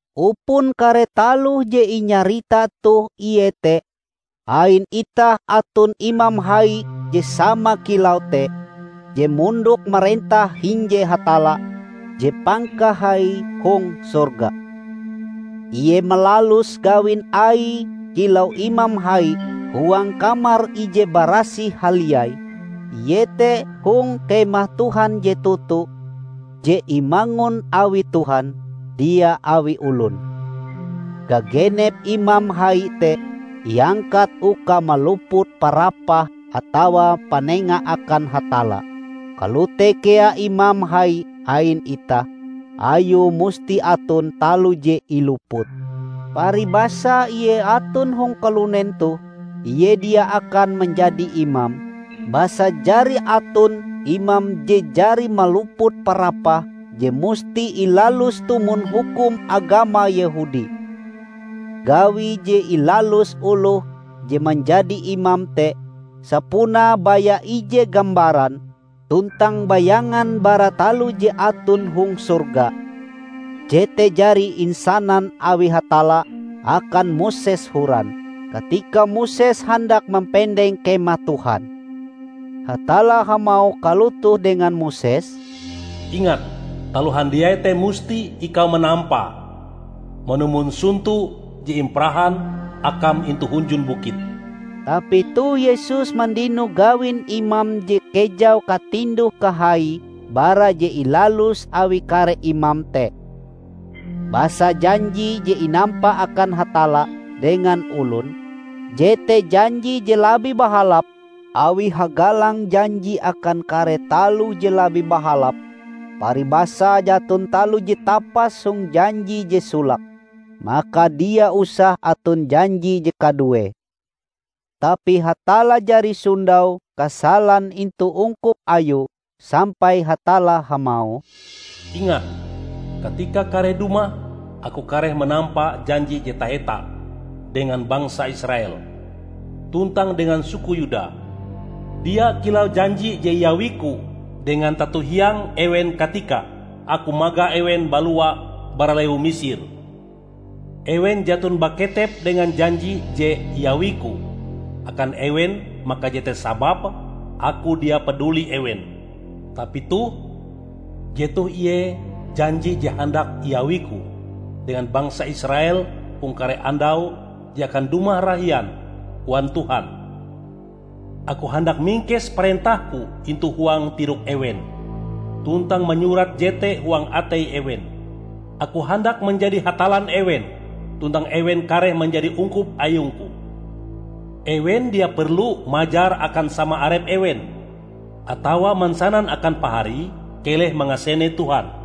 Upon kare taloh je inyarita toh iete: Ain itah aton Imam Hai je sama kilau te, je mondok marentah hinje Hatalla je Pangkahai hong sorga. Ie malalus gawin Aie kilau Imam Hai huang Kamar Ije Barasih Haliai, iete hong Kemah Tuhan je toto, je imangun awi Tuhan, dia awi olon. Gagenep imam hai te iangkat uka maluput parapah atawa panenga akan Hatalla. Kalote kea Imam Hai ain itah; Ayue musti aton taloh je ilupute. Paribasae Ie aton hong kalunen toh, Ie dia akan manjadi imam, basa jari aton imam je jari maluput parapah je musti ilalus tumon hukum agama Yehudi. Gawi je ilalus oloh je manjadi imam te sapunae baya ije gambaran tuntang bayangan bara taloh je aton hong sorga. Jete jari insanan awi Hatalla akan Moses horan, katika Moses handak mampendeng Kemah Tuhan. Hatalla hamauh kalotoh dengan Moses, "Ingat! Taloh handiai te musti ikau manampae manumon sonto je imparahan akam intu hunjun bukit." Tapi toh Yesus mandino gawin imam je kejau katinduh-kahaie bara je ilalus awi kare imam te. Basa janji je inampa akan Hatalla dengan olon, jete janji je labih bahalap awi hagalang janji akan kare taloh je labih bahalap. Paribasae jaton taloh je tapas hong janji je solake, maka dia usah aton janji je kaduee. Tapi Hatalla jari sondau kasalan intu ungkup Ayue, sampai Hatalla hamauh, "Ingat, katikae kareh dumah, Aku kareh manampa janji je taheta dengan bangsa Israel, tuntang dengan suku Yuda. Dia kilau janji je iawi-Ku dengan tato hiang ewen katika Aku magah ewen balua bara lewu Misir. Ewen jaton baketep dengan janji je iawi-Ku akan ewen; maka jete sababe Aku dia paduli ewen. Tapi toh, jetoh ie janji je handak iawiku dengan bangsa Israel hong kare andau je akan dumah rahian, koan Tuhan: Aku handak mingkes parentah-Ku intu huang tirok ewen, tuntang manyurat jete huang atei ewen. Aku handak manjadi Hatallan ewen, tuntang ewen kareh manjadi ungkup ayung-Ku. Ewen dia perlu majar akan sama arep ewen, atawa mansanan akan paharie, 'Keleh mangasene Tuhan.'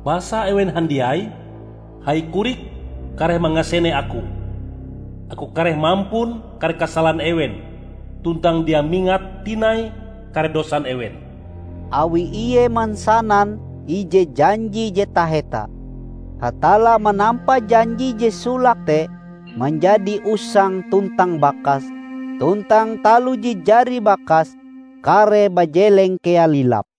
Basa ewen handiai, hai korik, kareh mangasene Aku. Aku kareh mampun kare kasalan ewen, tuntang dia mingat tinai kare dosan ewen." Awi Ie mansanan ije janji je taheta, Hatalla manampa janji je solake te manjadi usang tuntang bakas; tuntang taloh je jari bakas, kareh bajeleng kea lilap.